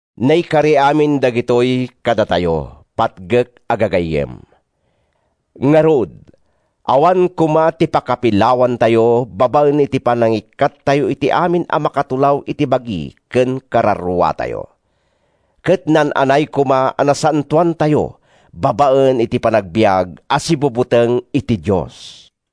Naikari amin dagitoy kadatayo, patgek a gagayyem! Ngarud, awan koma ti pakapilawantayo babaen iti panangikkattayo iti amin a makatulaw iti bagi ken kararuatayo. Ket naan-anay koma a nasantoantayo babaen iti panagbiag a sibubuteng iti Dios.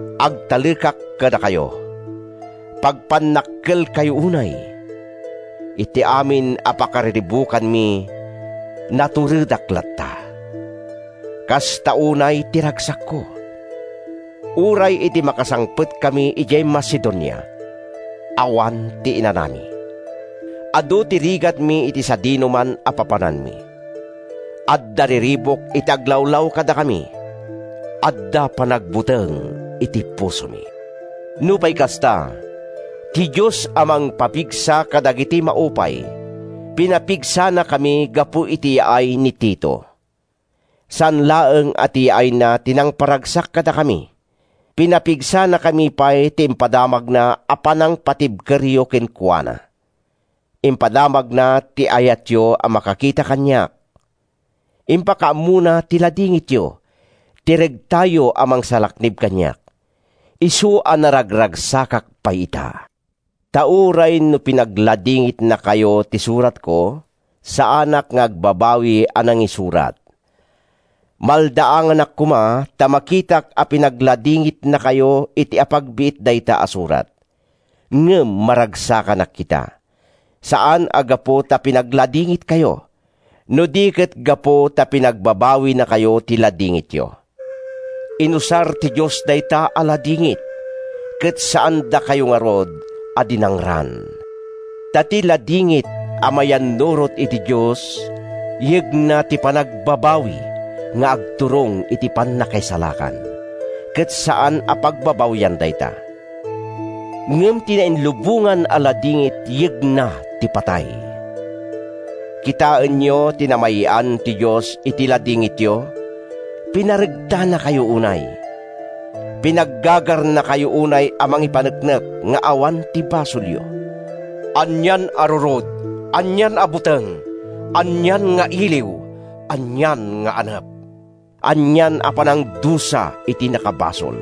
Agtalekak kadakayo; pagpannakkelkayo unay. Iti amin a pakariribukanmi, naturedak latta. Kasta unay ti ragsakko. Uray idi makasangpetkami idiay Macedonia, awan ti inanami. Adu ti rigatmi iti sadinoman a papananmi. Adda riribuk iti aglawlaw kadakami. Adda panagbuteng iti pusomi. Nupay kasta, ti Dios a mangpapigsa kadagiti maupay, pinapigsanakami gapu iti yaay ni Tito. Saan laeng a ti yaayna ti nangparagsak kadakami. Pinapigsanakami pay ti impadamagna a panangpatibkeryo kenkuana. Impadamagna ti ayatyo a makakita kaniak. Impakaammona ti ladingityo, ti regtayo a mangsalaknib kaniak. Isu a naragragsakak pay ita. Ta uray no pinagladingitnakayo ti suratko, saanak nga agbabawi a nangisurat. Maldaanganak koma ta makitak a pinagladingitnakayo iti apagbiit dayta a surat. Ngem maragsakanak ita—saan a gapu ta pinagladingitkayo, no di ket gapu ta pinagbabawinakayo ti ladingityo. Inusar ti Dios dayta a ladingit, ket saandakayo ngarud a dinangran. Ta ti ladingit a mayannurot iti Dios yegna ti panagbabawi nga agturong iti pannakaisalakan—ket saan a pagbabawyan dayta! Ngem ti nainlubongan a ladingit yegna ti patay. Kitaenyo ti namay-an ti Dios iti ladingityo! Pinaregtanakayo unay, pinaggagarnakayo unay a mangipaneknek nga awan ti basolyo! Anian a rurod, anian a buteng, anian nga iliw, anian nga anep, anian a panangdusa iti nakabasol!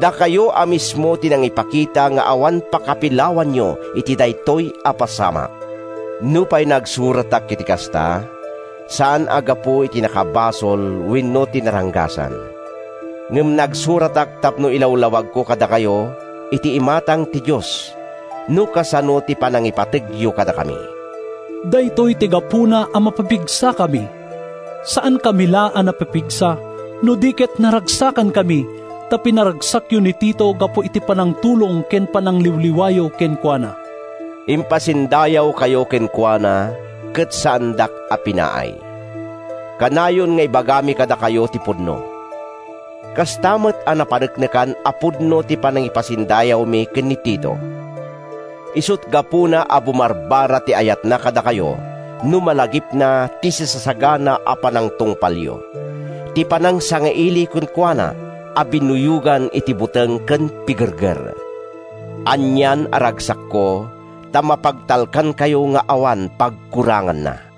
Dakayo a mismo ti nangipakita nga awan pakapilawanyo iti daytoy a pasamak. Nupay nagsuratak iti kasta, saan a gapu iti nakabasol wenno iti naranggasan. Ngem nagsuratak tapno ilawlawagko kadakayo, iti imatang ti Dios, no kasano ti panangipategyo kadakami. Daytoy ti gapuna a mapapigsakami. Saankami la a napapigsa, no di ket naragsakankami ta pinaragsakyo ni Tito gapu iti panangtulong ken panangliwliwayo kenkuana. Impasindayawkayo kenkuana ket saandak a pinaay. Kanayon nga ibagami kadakayo ti pudno. Kasta met a napaneknekan a pudno ti panangipasindayawmi ken ni Tito. Isut’ gapuna a bumarbara ti ayatna kadakayo no malagipna ti sisasagana a panagtungpalyo, ti panangsangailiyo kenkuana a binuyogan iti buteng ken pigerger. Anian a ragsakko ta mapagtalkankayo nga awan pagkuranganna!